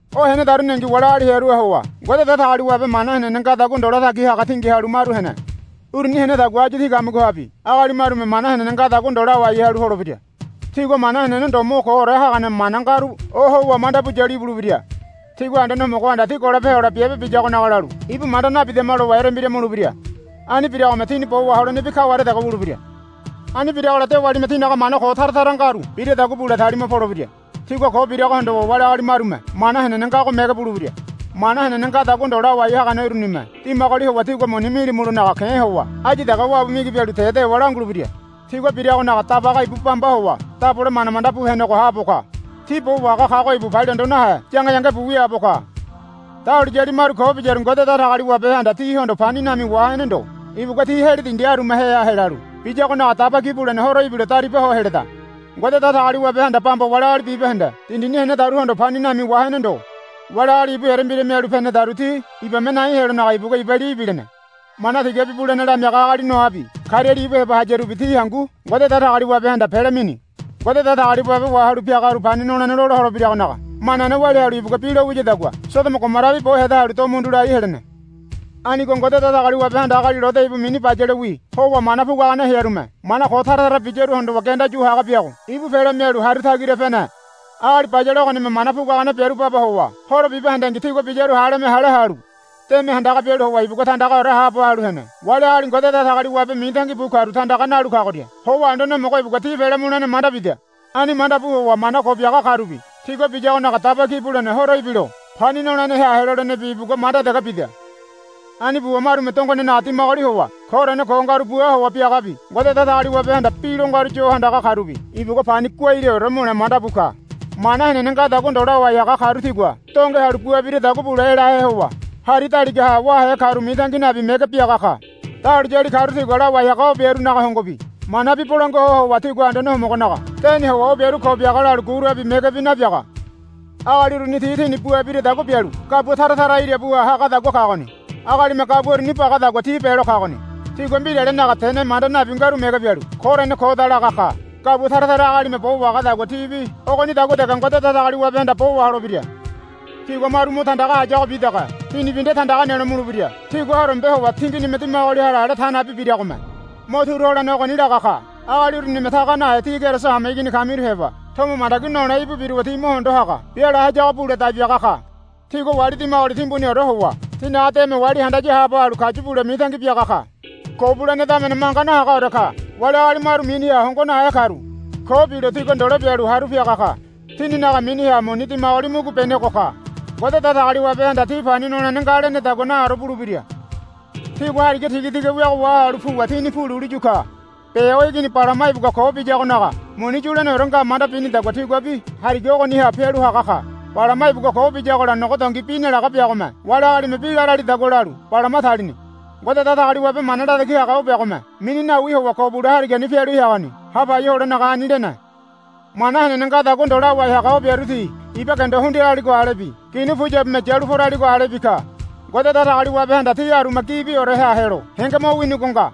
O henedaruningi wali agali hearuha howa Ngode Datagaliwabe mana henene ngadagua ndo latagi haga tingi halu maru hene. Uruni henedagua áyu tí kamigohabi agali marume mana henene ngadagua ndo lawai halu holebira. Tigua mana henene ndo mo koore hagane mana ngaru ohowa manda bu yalu ibulebira. Tigua Anduane Homogohanda ti golope hole biabe biyagonaga lalu, Ibu manda nabidama, lowa erembira mulebira. Ani biragome tini bo waholenebi kaware dege wulebira. Ani biragola dewalime tinaga mana ko tara tara ngaru biradagua bule talima polebira. Tigua ko birago hondowa wali agali marume Mana Henene ngago mege bulebira. Mana henene ngadagua ndo lawai hagane urunime dimagoli howa tígua muni milimulonaga ke̱ howa áyu dege wabu migi bialu te dewa langulebira. Tigua biragonaga Dabaga ibu bamba howa dabole manda mandabu henego haabo ka. Ti Bo Wahaga kago ibu palia hondo nahe yange yangebu wiaabo ka. Dahuliyali maru ko biyaru Ngode Datagaliwabehanda tihondo pani nami wahene ndo. Ibugua ti heli dindi arumaheha helalu biyagonaga Daba Ki Bulene Horo ibilo daribaho heleda. Ngode Datagaliwabehanda bamba wali agali bibahende dindini henedaruhondo pani nami wahene ndo. Wali agali ibu erembira mialu penedaru ti ibame nai helonaga ibugua iba li ibilene. Mana tigabi bulene lamiaga agali Noabi kariali ibu heba hayarubi ti hangu Ngode Datagaliwabehanda pele mini. Ngode Datagaliwabe wahalu piagaru pani nolene lola holebiragonaga manane walia halu ibugua bi lo wiyadagua Sodomo Gomorabi bo heda halu do mundu lai helene. Anigo Ngode Datagaliwabehanda agali Lode ibu mini bayalewi howa mana puguagane hearume mana ko tara tara biyaru hondowa genda yu haga biago ibu pele mialu haru tagira pene. Agali bayale ogonime mana puguagane biaru baba howa horo bibahendengi tigua biyaru haleme hale halu deme handaga bialu howa ibugua tandagaore haabo halu hene. Wali agali Ngode Datagaliwabe mitangi bu karu tandaga nalu kagoria howa Anduane Homogo ibugua ti pele mulene manda bida. Ani manda bu howa mana ko biaga karubi tigua biyagonaga Daba Ki Bulene Horo ibilo pani noleneha helolenebi ibugua manda dege bida. Ani buwa marume dongonenaga dimagoli howa koorene ko ngaru bua howa biagabi Ngode Datagaliwabehanda bi lo ngaru yo handaga karubi ibugua pani guaileore mule manda bu ka. Mana henene ngadagua ndo lawai haga karu tigua donge halu bua biradagua bule elahe howa hari daligaha wáhe karu mitangi nabi mege biaga ka. Dahuliyali karu tigua lawai haga o biarunaga hongobi manabi bolangua ho howa tigua Anduane Homogonaga deni howa o biaru ko biaga lalu gurabi megebi nabiaga. Agali uruni ti tini bua biradagua bialu gabua tara tara irabuha hagadagua kagoni. Agalime gabua uruni bagadagua ti belo kagoni. Tigua mbiralenaga tene manda nabi ngaru mege bialu, Koorene koda, laga ka. Gabua tara tara agalime bo wahagadagua tibi ogonidagua dege Ngode Datagaliwabehanda bo waholebira. Tigua maru mo tandaga hayagobi dege tinibi nde tandaga nelo mulebira. Tigua horombe howa tinginime dimagoli hara ale ta nabi biragome mo turu holene ogoni laga ka. Agali urunime taga nahe tí Keriso hameigini kamiru heba tomo mandagi nole íbu biruwa ti mo hondo haga biala hayago bule dai biaga ka. Tigua wali dimagoli timbuniore howa tinaga deme wali handaya haabo halu kayu bule mitangi biaga ka. Ko bulene damene manga nahagaore ka. Wali agali maru miniha hongo nahe karu ko bilo tigua ndole bialu haru piaga ka. Tininaga miniha muni dimagoli mugubenego ka. Ngode Datagaliwabehanda ti pani nolene nga lenedagua naore bulebira. Tigua hariga tigatiga wiago wahalu puwa tini pu lulu yu ka. Beo igini Balama ibugua ko biyagonaga muni yuleneore nga manda binidagua tiguabi hariga ogoniha pialu haga ka. Balama ibugua ko biyagola nogo dongi bi nalaga biagome wali agalime bi laralidagua lalu Balama talini. Ngode Datagaliwabe mana latagi haga o biagome mini nawi howa ko bule harigani pialu heagoni ha pai holenaga ani lene. Mana henene ngadagua ndo lawai haga o biaru ti iba gendo hundiraligo alebi ginu puyabume yalu poraligo alebi ka. Ngode Datagaliwabehanda ti aruma gibioreha helo henge mo winigo nga.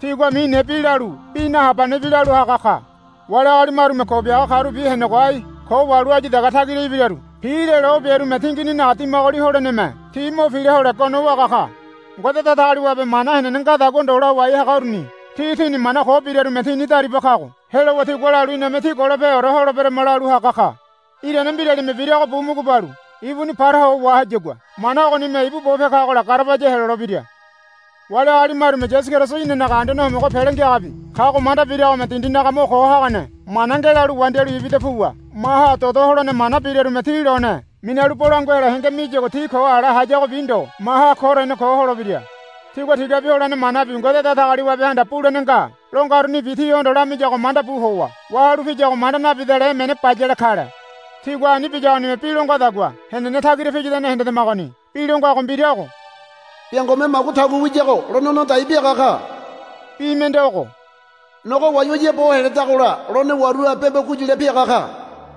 Tigua mine bi lalu bi nahabanebi lalu haga ka. Wali agali marume ko biaga karubi henego ai ko wahalu áyu dege tagira ibiraru pilelo o biarume tingininaga dimagoli holeneme ti mo pila hole gono waga ka. Ngode Datagaliwabe mana henene ngadagua ndo lawai haga uruni ti tini mana ko birarume tini dariba kago helowa tigua lalu, Iname tí golopeore holeberama, lalu haga ka. Irane mbiralime birago bu mugu balu ibuni paraho wahayagua mana ogonime ibu bope kagola garabaya helolebira. Wali agali marume Yasu Keriso inanaga Anduane Homogo Pele Ngiagabi kago manda biragome dindinaga mo ko hagane mana ngelalu wandialu ibida puwa maha dodo holene mana biarume ti lone minalu bolangua helo henge miyagua ti ko ala hayagobi ndo maha koorene ko holebira. Tigua tigabi holene manabi Ngode Datagaliwabehanda, Bulene nga, lo ngarunibi tihondo lamiyago manda bu howa wahalu piyago manda nabidale emene bayale kale. Tigua ani biyagonime bi lo ngadagua henene tagira piyadane hendedemagoni. Bi lo ngago mbira ogo, Biangome magu tagu wiyago lone no dai biaga ka. Bi mende ogo, Nogo wayawaya bo heledagola lone waruha bembo guyule piaga ka.